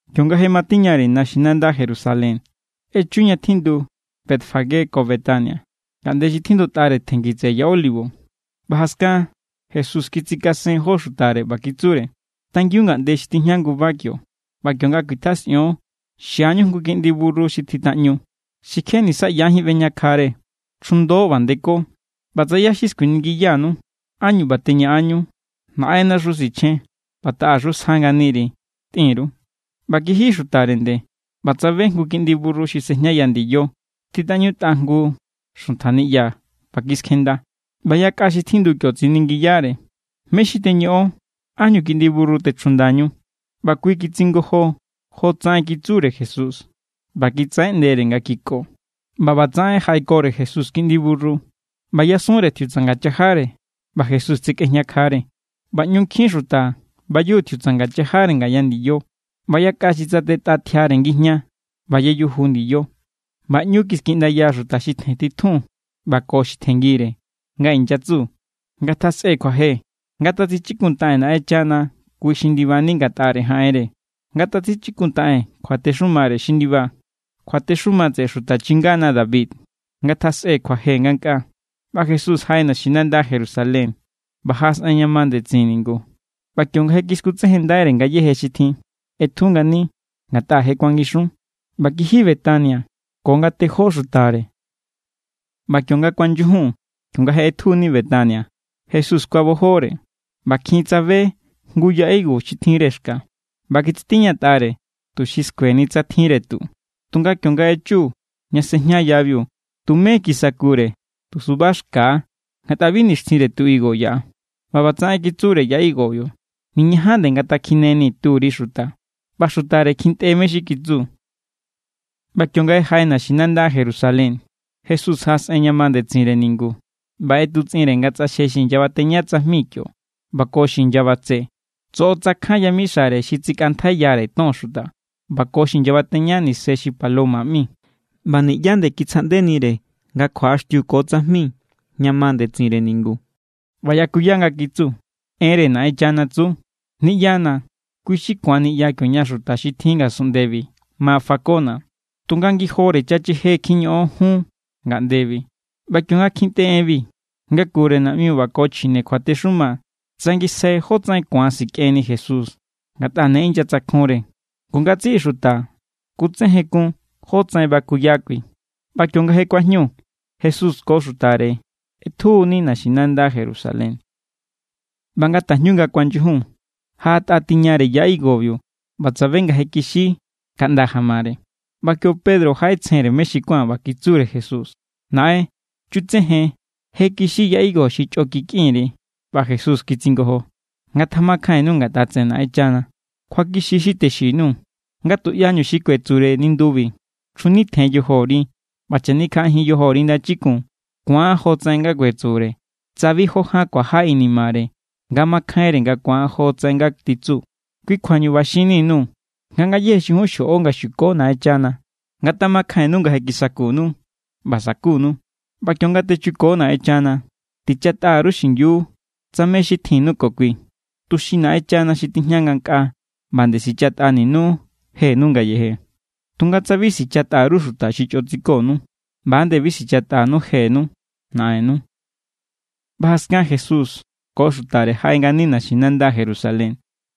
Kionga je matiñare naxinanda Jerusalén, echu ña tjindu Betfagé ko Betania, ngaꞌnde xi tjindutꞌare tjenngi tseꞌe Ya Olivo. ꞌBa jaskan Jesús kitsikasen jó xutare. ꞌBa kitsure: —Tangiun ngaꞌnde xi tijña nguba kio, ꞌba kionga kuitjasꞌion, xiañu jngu kiꞌndi burru xi tjitaꞌñu, xi kje nisa ꞌyajín ꞌbejñakjare. Chjundo ꞌba ndeko. ꞌBa tsa ꞌyá xi skuiningiyanu ánñu ꞌba teñaꞌanñu, “Naꞌennaxu sichjen ꞌba taꞌaxu sja nganiri”, tꞌin_ru. ꞌBa kiji xutare nde, ꞌba tsabe jngu kiꞌndi burru xi sejñaya ndiyo, tjitaꞌñutꞌa jngu xuntja niꞌya, ꞌba kiskjenda. ꞌBa yakꞌa xi tjindu kio tsiningiyare: —¿Mé= xi teñoꞌon? ¿Ánñu kiꞌndi burru techjundañú? ꞌBa kui kitsingojo jotsaꞌen kitsure Jesús; ꞌba kitsaꞌeꞌndere nga kiko. ꞌBa ꞌbatsaꞌen jaꞌekore Jesús kiꞌndi burru, ꞌba yasunre tjiutsanga chajare ꞌba Jesús tsakꞌejñakjare. ꞌBa ꞌñu nkjin xuta bayuju tjiutsanga chajare ngaya ndiyo, ꞌba yakꞌa xi tsatetꞌa tjiare ngijña ꞌba yayuju ndiyo. ꞌBa ꞌñu kiskiꞌndaya xuta xi tjentitjun, ꞌba ko xi tjenngire, nga inyatsu: —¡Ngatjasꞌe kjuaje! ¡Ngatatsichikuntaꞌen Naꞌenchana kui xi ndibani ngatꞌare jaꞌenre! ¡Ngatatsichikuntaꞌen kjuatexumare xi ndiba, kjuatexuma tseꞌe xuta chingana David! ¡Ngatjasꞌe kjuaje ngankꞌaa! ꞌBa Jesús jaꞌe naxinanda Jerusalén, ꞌba jaꞌasꞌen ña ma ndetsin ningu; ꞌba kionga je kiskutsejenndaire ngayéje xi tjin, ꞌetju ngani, ngatꞌa je kuangixun. ꞌBa kiji Betania ko ngatejó xutare. ꞌBa kionga kuanyujun, kionga je ꞌetjuni Betania, Jesús kuabojore. ꞌBa kjin tsabe jngu ya higo xi tjinre xka; ꞌba kitsitiñatꞌare tuxi skueni tsa tjinre tu. Tunga kionga echu ña sejña yabiu, tumé kisakure, tu suba xka= ngatꞌa bi nixtjinre tu higo yaꞌa. ꞌBa ꞌbatsaꞌen kitsure ya higobiu: —Niñajan nde ngatakjineni turi xuta. ꞌBa xutare kjintꞌe mé= xi kitsu. ꞌBa kionga jaꞌe naxinanda Jerusalén, Jesús jaꞌasꞌen ña ma ndetsinre ningu ꞌba ꞌetutsꞌinre nga tsꞌaxje xi inyabateña tsajmi kio ꞌba ko xi inyabatse. Tsoꞌotsakjan yamixare xi tsikꞌantjaiyare ton xuta, ꞌba ko xi inyabateña nise xi paloma ꞌmi; ꞌba niꞌyá nde kitsjaꞌndenire nga kjuaꞌaxtiu ko tsajmi ña ma ndetsinre ningu. ꞌBa yakuya, nga kitsu: —Enre Naꞌenchana tsu: “Niꞌyana̱ kui= xi ku̱an niꞌya kioña xuta xi tjin ngasunꞌndebi ma fakona̱”, tunga ngijore chacheje kjiñoꞌon jun ngaꞌndebi. ꞌBa kionga kjintꞌe enbi, ngakure naꞌmiu ꞌba ko xuta chjine kjuatexuma tsangisjai jótsaꞌen ku̱an sikꞌenni Jesús, ngatꞌa ne inyatsakjunre. Ngu ngatsiꞌi xuta kutsejenkun jotsaꞌen bakuya kui. ꞌBa kionga je kuajñu, Jesús ko xutare ꞌetjuni naxinanda Jerusalén. ꞌBa nga tajñu nga kuanyujun, jaꞌatꞌa tiñare ya higobiu ꞌba tsabe nga je kixi kaꞌnda jamare. ꞌBa kio Pedro jaꞌetsjenre mé= xi kuán, ꞌba kitsure Jesús: —Naꞌen, chutsejen, je kixi ya higo xi chꞌo kikꞌin_ri. ꞌBa Jesús kitsingojo: —Ngatamakjainnu ngatꞌa tseꞌe Naꞌenchana. Kjuakixi= xi texin_nuu̱, nga tuꞌyañu xi kuetsure nindubi: “Chjunitjen yojori, ꞌba chanikjaꞌajin yojori ndachikun”, ku̱an jotsaꞌen nga kuetsure tsa bi jó ján kuaja inimare nga makjainre nga ku̱an jotsaꞌen nga titsu. Kui kjuañu ꞌba xinni_nuu̱ nga ngayéje xi jun xjoꞌo nga xuko Naꞌenchana, ngatamakjainnu nga je kisakunnu, ꞌba sakunu. ꞌBa kionga techuko Naꞌenchana, tichatꞌa_ru xingiu tsa mé= xi tjinnu ko kui, tuxi Naꞌenchana xi tijña ngankꞌaa ꞌba nde sichatꞌaninu jenu ngayeje. Tunga tsa bi sichꞌatꞌa_ru xuta xi chꞌo tsikonu, ꞌba=nde bi sichatꞌanu jenu Naꞌennu. ꞌBa jaskan Jesús ko xutare jaꞌe ngani naxinanda Jerusalén.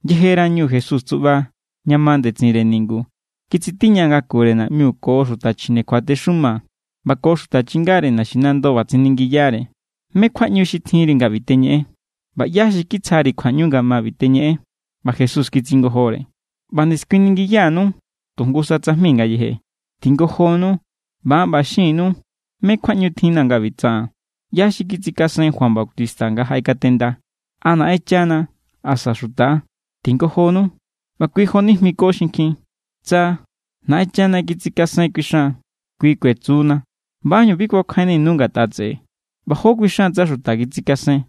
Yejerañu Jesús tsuꞌba ña ma ndetsinre ningu, kitsitiña ngakure naꞌmiu, ko xuta chjine kjuatexuma ꞌba ko xuta chingare naxinando, ꞌba tsiningiyare: —¿Mé= kjuaꞌñu xi tjinri nga ꞌbi teñeꞌen? ꞌBa ¿ꞌyá xi kitsjari kjuaꞌñu nga ma ꞌbi teñeꞌen? ꞌBa Jesús kitsingojore: —ꞌBa nde skuiningiya_nuu̱ tu jngusa tsajmi ngayeje; tingojonu, ꞌba an ꞌba xin_nuu̱ mé= kjuaꞌñu tjinna̱ nga ꞌbi tsaꞌaa̱n. ¿ꞌYá= xi kitsikasen Juan Bautista nga jaꞌekatenda, a Naꞌenchana asa xuta=? Tingojonu. ꞌBa kui jonijmiko xinkjin: —Tsa “Naꞌenchana kitsikasen” kuixan, kui kuetsu=na “¿ꞌBa ánñu bi kuakjainninu ngatꞌa tseꞌe?” ꞌBa ¿jó kuixan tsa xuta kitsikasen?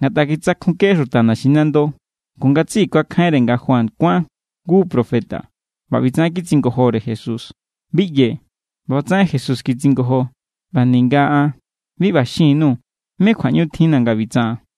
Ngatꞌa kitsakjunke xuta naxinando, ngu ngatsiꞌi kuakjainre nga Juan kuán jngu profeta. ꞌBa ꞌbitsaꞌen kitsingojore Jesús: —Bi ꞌyee̱. ꞌBa ꞌbatsaꞌen Jesús kitsingojo: —ꞌBa ninga an bi ꞌba xin_nuu̱ mé kjuaꞌñu tjinna̱ nga ꞌbi tsaꞌaa̱n.